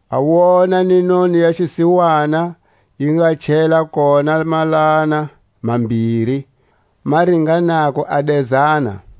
A wona ni noni ya xisiwana yi nga chela kona malana mambiri ma ringanako a dezana.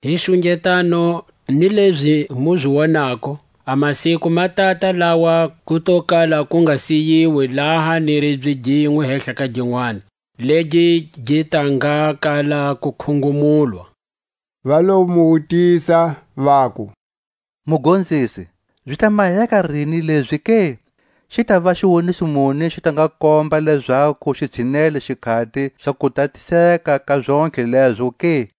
Hi xungetano ni lezi mu zi wonako, a masiku ma tata lawa ku to kala ku nga siyiwi laha ni ribye ginwe hehla ka ginwani, legi gi ta nga kala ku khungumulwa. Va lo mu wutisa, vaku: Mugonzisi, zi ta maheka rini lezi ke? Xi tava xiwoniso muni xi ta nga komba lezaku xi tshinele xikhati xa kutatiseka ka zontlhe lezo ke?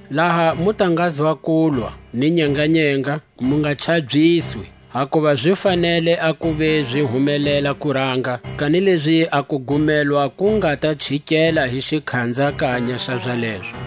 Laha mu ta ngazwa kulwa ni nyenganyenga, mu nga chabyiswi; hakuva zi fanele a kuva zi humelela kuranga; kanilezi a kugumelwa ku nga ta chikela hi xikhanzakanya xa zalezo.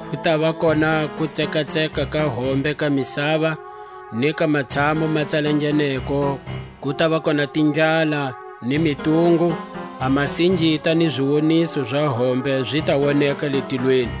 Ku tava kona kutsekatseka ka hombe ka misava, ni ka matshamu ma tsalangeneko ku tava kona tindlala ni mitungu; a masingita ni ziwoniso za hombe zi ta woneka le tilweni.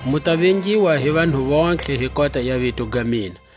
Mu ta vengiwa hi vanhu vontlhe hi kota ya vito ga mina.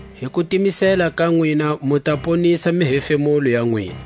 Hi kutimisela ka nwina mu ta ponisa mihefemulo ya nwina.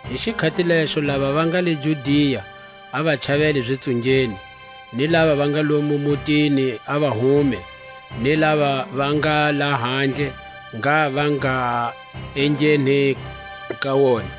Hi xikhati lexo lava va nga le Judia, a va chavele zitsungeni; ni lava va nga lomo mutini a va hume; ni lava va nga lahandle, ngha va nga engheni ka wona.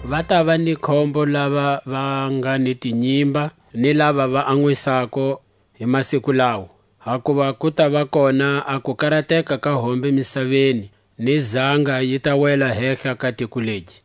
Va tava ni khombo lava va nga ni tinyimba, ni lava va anwisako hi masiku lawo! Hakuva ku tava kona a kukarateka ka hombe misaveni, ni zanga yi ta wela hehla ka tiko legi.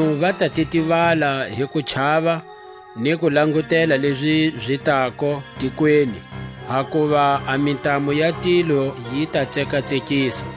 Vanhu va ta titivala hi kuchava, ni ku langutela lezi zi tako tikweni; hakuva a mintamu ya tilo yi ta tsekatsekiswa.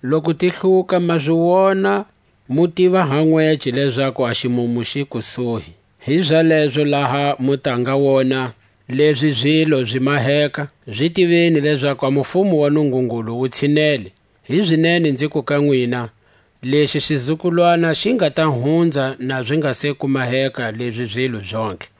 loku ti hluka, ma zi wona mu tiva ha nwece, lezaku a ximumu xi le kusuhi. Hizalezo laha mu ta nga wona lezi zilo zi maheka, zi tiveni lezaku a mufumo wa Nungungulu wu tshinele. Hizinene nziku ka nwina: Lexi xizukulwana xi nga ta hunza, na zi nga se ku maheka lezi zilo zontlhe.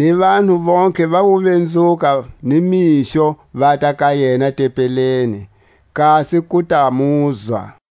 Ni vanhu vontlhe va wo vinzuka ni mixo vata ka yena tempeleni, kasi ku ta muzwa.